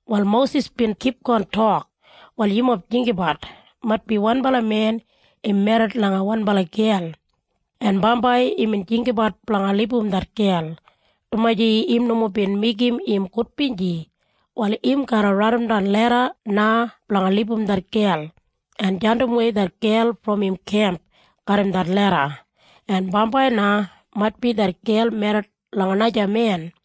Wal Mosis bin kipgon tok, “Wal yumob jinggabat. Maitbi wanbala men im merrit langa wanbala gel, en bambai imbin jinggabat blanga libum det gel, dumaji im nomo bin meigim im gudbinji. Wal im garra raidimdan leda na blanga libum det gel, en jandimwei det gel brom im kemp garram det leda. En bambai na maitbi det gel merrit langa naja men.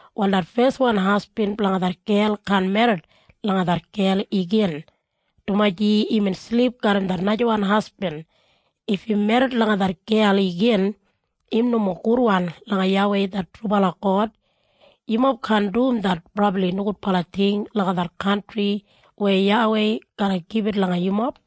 Wal det feswan hasbin blanga det gel kaan merrit langa det gel igin, dumaji imbin silip garram det najawan hasbin. If im merrit langa det gel igin, im nomo gudwan langa YAWEI det trubala God. Yumob kaan dum det brabli nogudbala ting langa det kantri weya YAWEI garra gibit langa yumob.”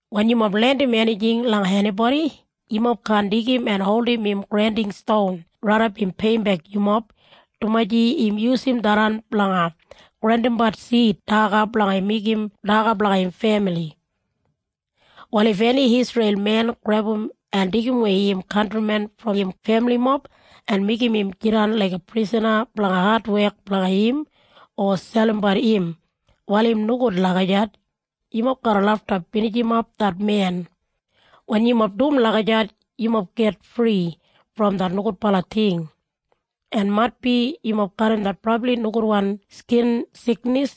“Wen yumob lendim enijing langa enibodi, yumob kaan deigim en holdim im granding ston raidap im peiyimbek yumob, dumaji im yusum tharran blanga grandimbat sid daga blanga meigim daga blanga im femili. “Wal if eni Isreil men grebum en deigimwei im kantrimen brom im femilimob en meigim im jidan laiga prisana blanga adwek blanga im, o selimbat im, wal im nogud lagijat. Yumob garra lafta binijimap det men. Wen yumob dum lagijat yumob git fri brom det nogudbala ting. “En maitbi yumob garram det brabli nogudwan skin siknis.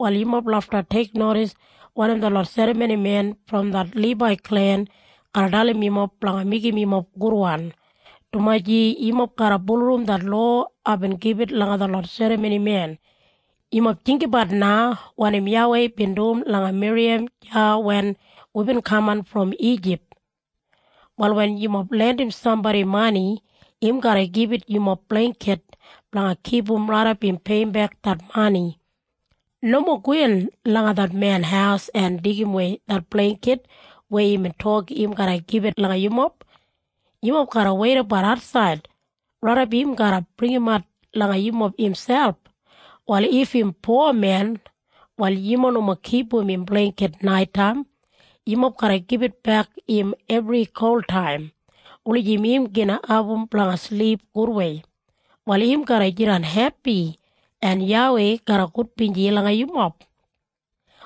Wal yumob lafta teiknodis wanim detlot serramonimen brom det Libai klen garra dalim yumob blanga meigim yumob gudwan, dumaji yumob garra bulurrum det lowa aibin gibit langa detlot serramonimen. Yumob jinggabat na wanim YAWEI bin dum langa Miriyam deya wen wibin kaman brom Ijip. “Wal wen yumob lendim sambodi mani, im garra gibit yumob bleingkit blanga kipum raidap im peiyimbek det mani. Nomo gowin langa det men haus en deigimwei det bleingkit weya imbin tok im garra gibit langa yumob. Yumob garra weidabat atsaid, raidap im garra bringimat langa yumob imselp. Wal if im po men, wal yumob nomo kipum im bleingkit naitaim. Yumob garra gibitbek im ebri koltaim, wulijim im gin abum blanga silip gudwei. Wal im garra jidan hepi, en YAWEI garra gudbinji langa yumob.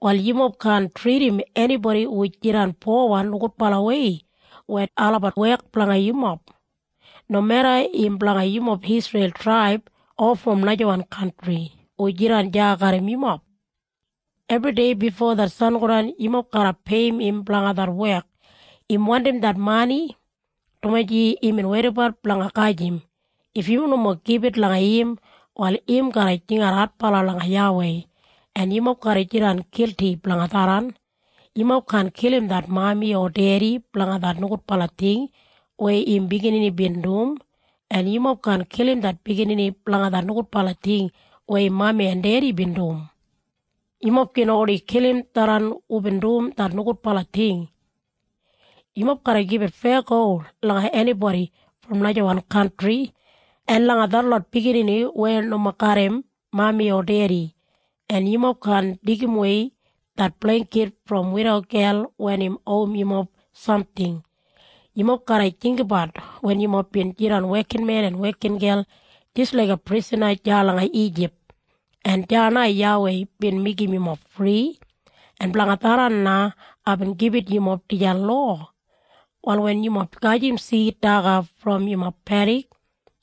“Wal yumob kaan tridim enibodi hu jidan powan nogudbalawei wen olabat wek blanga yumob, nomeda im blanga yumob Isreil traib o brom najawan kantri hu jidan deya garram yumob. Ebridei bifo det sangodan yumob garra peiyim im blanga det wek. Im wandim det mani, dumaji imbin weidabat blanga gajim. If yumob nomo gibit langa im, wal im garra jingat adbala langa YAWEI, en yumob garra jidan gilti blanga tharran. “Yumob kaan kilim det mami o dedi blanga det nogudbala ting weya im biginini bin dum, en yumob kaan kilim det biginini blanga det nogudbala ting weya im mami en dedi bin dum. Yumob gin oni kilim tharran hubin dum det nogudbala ting. “Yumob garra gibit feyago langa enibodi brom najawan kantri, en langa detlot biginini weya nomo garram mami o dedi, en yumob kaan deigimwei det bleingkit brom eni widogel wen im owim yumob samting. Yumob garra jinggabat wen yumob bin jidan wekinmen en wekingel jis laiga prisana deya langa Ijip, en deya na YAWEI bin meigim yumob fri, en blanga tharran na aibin gibit yumob dijan lowa. “Wal wen yumob gajim sid daga brom yumob pedik,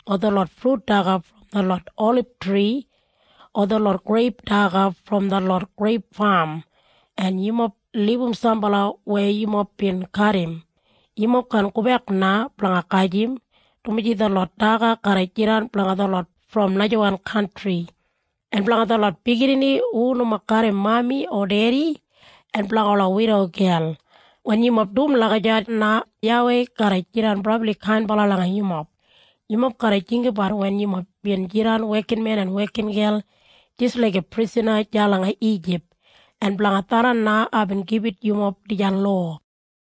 o detlot frut daga brom detlot olibtri o detlot greip daga brom detlot greip fam en yumob libum sambala weya yumob bin kadim, yumob kaan gobek na blanga gajim, dumaji detlot daga garra jidan blanga detlot brom najawan kantri, en blanga detlot biginini hu nomo garram mami o dedi, en blanga ola widogel. Wen yumob dum lagijat na YAWEI garra jidan brabli kainbala langa yumob. Yumob garra jinggabat wen yumob bin jidan wekinmen en wekingel jis laiga prisana deya langa Ijip, en blanga tharran na aibin gibit yumob dijan lowa.”